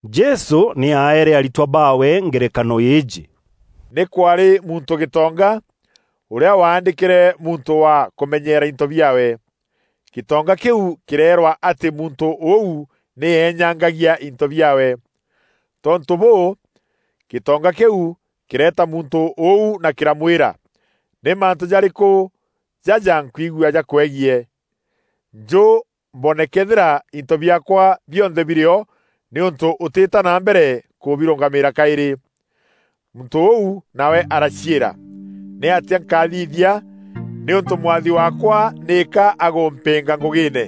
Jesû nî aeere aritwa baawe ngerekano îîjî, “Nî kwaarî muntû gîtonga, ûrîa waandîkîre muntû wa kûmenyeera into biaawe. Gîtonga kîu kîreerwa atî muntû ûu nî eenyangagia into biaawe. Tontû bûû, gîtonga kîu kîreeta muntû ûu na kîramwîra, ‘Nî mantû jarîkû jaja nkwigua jakwegiî? Njû mbone këethîra into biaakwa bionthe birî o nîûntû ûtîîta na mbere kûbirûngamîîra kaîrî.’ Muntû ûu nawe araciîra, ‘Nîatîa nkathithia, nîûntû mwathi waakwa nîka agûmpînga ngûgîîne?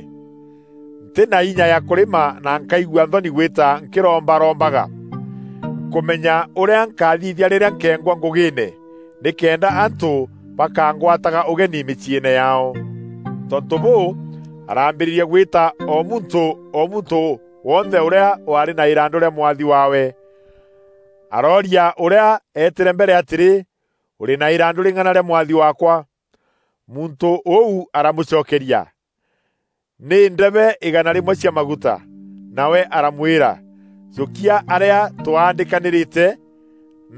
Ntî na inya ya kûrîma na nkaigua nthoni gwîta nkîrombarombaga. Nkûmenya ûrîa nkathithia rîrîa nkeengwa ngûgîîne, nîkenda antû bakangwataga ûgeni mîciîne yaao.’ Tontû bûû, araambîrîria gwîta o muntû o muntû wonthe ûrîa waarî na îrandû rîa mwathi waawe. Arooria ûrîa eetîre mbere atîrî, ‘Ûrî na îrandû rîng'ana rîa mwathi waakwa?’ Muntû ûu aramûcokeria, ‘Nî ndeebe îgaana rîmwe cia maguta.’ Nawe aramwîra, ‘Jûkia arîa twandîkanîrîte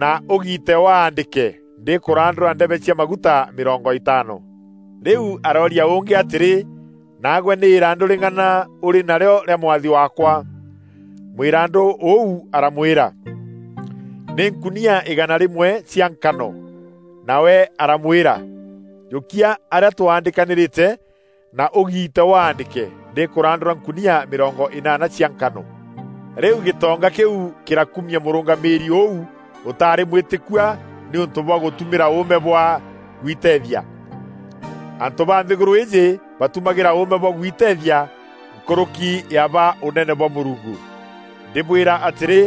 na ûgiite waandîke ndîkûrandûra ndebe cia maguta mîrongo îtaano.’ Rîu arooria ûngî atîrî, ‘Naagwe nî îrandû rîng'ana ûrî narîo rîa mwathi waakwa?’ Mwîrandû ûu aramwîra, ‘Nî nkunia îgaana rîmwe cia nkano!’ Nawe aramwîra, ‘Jûkia arîa twandîkanîrîte na ûgiite waandîke ndîkûrandûra nkunia mîrongo înaana cia nkano.’ Rîu gîtonga kîu kîrakumia mûrûngamîîri ûu ûtaarî mwîtîkua nîûntû bwa gûtumîra ûûme bwa gwiteethia. Antû ba nthîgûrû îîjî batumagîra ûûme bwa gwiteethia nkûrûki ya ba ûnene bwa Mûrungu. Ndîbwîra atîrî,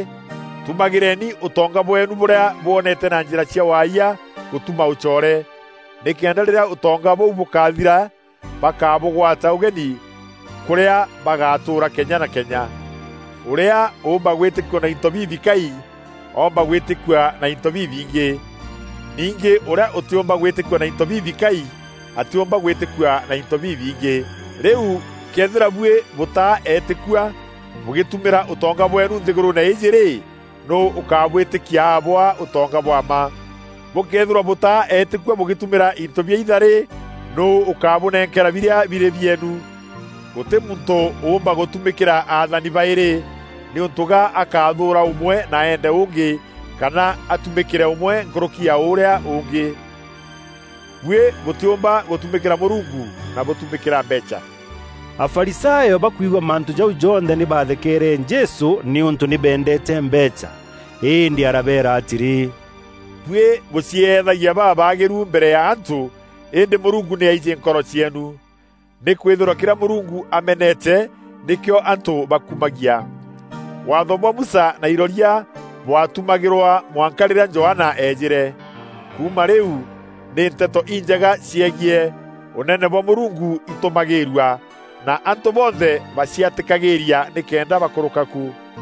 tûmagîreni ûtonga bweenu bûrîa bwonete na njîra cia waayia gûtuma ûcoore, nîkenda rîrîa ûtonga bûu bûkathira, bakabûgwata ûgeni kûrîa bagatûûra kenya na kenya. Ûrîa ûûmba gwîtîkua na into bibikai, oomba gwîtîkua na into bibingî. Ningî ûrîa ûtîûmba gwîtîkua na into bibikai, atîûmba gwîtîkua na into bibingî. Rîu këethîra buî bûtaa eetîkua bûgîtumîra ûtonga bweenu nthîgûrûûne îîjî rî, nûû ûkabwîtîkia abwaa ûtonga bwa mma? Bûkëethîrwa bûtaa eetîkua bûgîtumîra into biaitha rî, nûû ûkabûnenkera birîa birî bieenu? Gûtî muntû ûûmba gûtumîkîra athani baîrî nîûntû ga akathûûra ûmwe na eende ûngî kana atumîkîre ûmwe nkûrûki ya ûrîa ûngî. Buî bûtîûmba gûtumîkîra Mûrungu na bûtumîkîra mbeecha.” Afarisayo bakwigua mantû jau jonthe nî bathekeere Jesû, nîûntû nî beendeete mbeecha. Îndî arabeera atîrî, “Buî bûcieethagia babaagîru mbere ya antû îndî Mûrungu nî aijî nkoro cieenu. Nîkwîthîrwa kîrîa Mûrungu amenete nîkîo antû bakumagia. Waatho bwa Musa na iroria bwatumagîrwa mwanka rîrîa Johana eejîre. Kuuma rîu nî nteto injega ciegiî Ûnene bwa Mûrungu itûmagîîrua, na antû bonthe baciatîkagîîria nîkenda bakûrûka ku.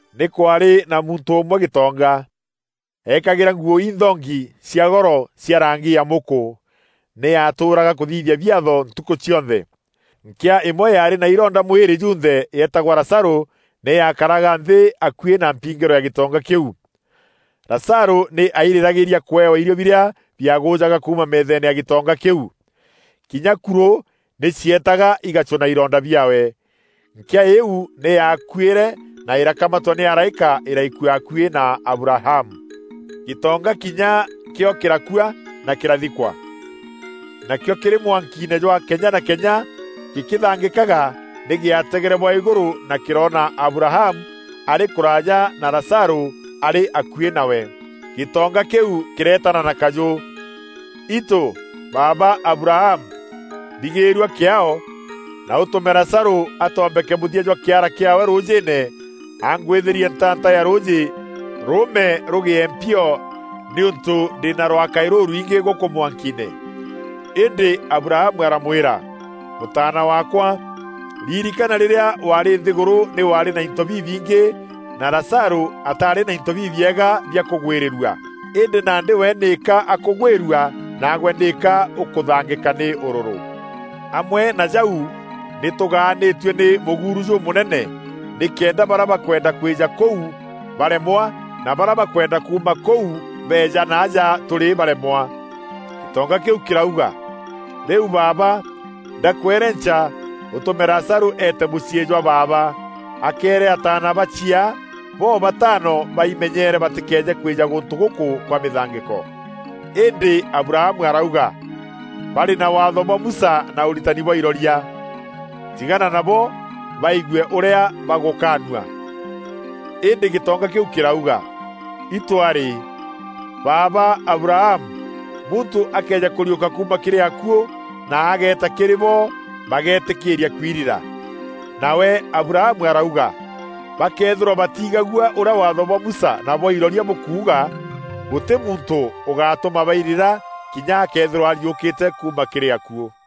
“Nî kwaarî na muntû ûmwe gîtonga. Eekagîra nguû inthongi cia goro cia rangî ya mûkû. Nî aatûraga kûthithia biatho ntukû cionthe. Nkîa îmwe yaarî na ironda mwîrî junthe yeetagwa Lazarû nî yaakaraga nthî akuî na mpingîro ya gîtonga kîu. Lazarû nî airîragîîria kûewa îrio birîa biagûjaga kuuma meetheene ya gîtonga kîu. Kinya kurû nî cietaga igacûna ironda biaawe. Nkîa îîu nî yaakuîre na îrakamatwa nî araîka îraikua akuî na Abrahamu. Gîtonga kinya kîo kîrakua na kîrathikwa. Nakîo kîrî mwankiine jwa kenya na kenya gîkîthangîkaga nî gîategere bwa îgûrû na kîroona Abrahamu arî kûraaja na Lazarû arî akuî nawe. Gîtonga kîu kîreetana na kajû, ‘Itû, Baaba Abrahamu, mbîgîîrua kîaao, na ûtûme Lazarû atombeke mûthia jwa kîara kîaawe rûûjîîne angwîthîrie ntaanta ya rûûjî rûûme rûgîe mpio nîûntû ndî na rwakaî rûrwingî gûkû mwankiine.’ Îndî Abrahamu aramwîra, ‘Mûtaana waakwa, ririkana rîrîa waarî nthîgûrû nî waarî na into bibingî na Lazarû ataarî na into bibiega bia kûgwîrîrua. Îndî nandî we nîka akûgwîrua naagwe nîka ûkûthangîka nî ûrûrû. Amwe na jau nî tûgaanîtue nî mûguuru jûmûnene nîkenda barîa bakwenda kwîja kûu baremwa na barîa bakwenda kuuma kûu beeja naaja tûrî baremwa.’ Gîtonga kîu kîrauga, ‘Rîu baaba, ndakwerenca ûtûme Lazarû eete mûciî jwa baaba, akeere ataana ba chiaa bo-bataano baimenyere batîkeeje kwîja gûntû gûkû kwa mîthangîko.’ Îndî Abrahamu arauga, ‘Barî na Waatho bwa Musa na ûritani bwa iroria. Tigana nabo baigue ûrîa bagûkaanua.’ Îndî gîtonga kîu kîrauga, ‘Itû arî, baaba Abrahamu, muntû akëeja kûriûka kuuma kîrî akuû na ageeta kîrî bo bageetîkîîria kwirira.’ Nawe Abrahamu arauga, ‘Bakëethîrwa batiigagua ûrîa Waatho bwa Musa na bwa iroria bûkuuga, gûtî muntû ûgatûma bairira kinya akeethîrwa ariûkîte kuuma kîrî akuû.’”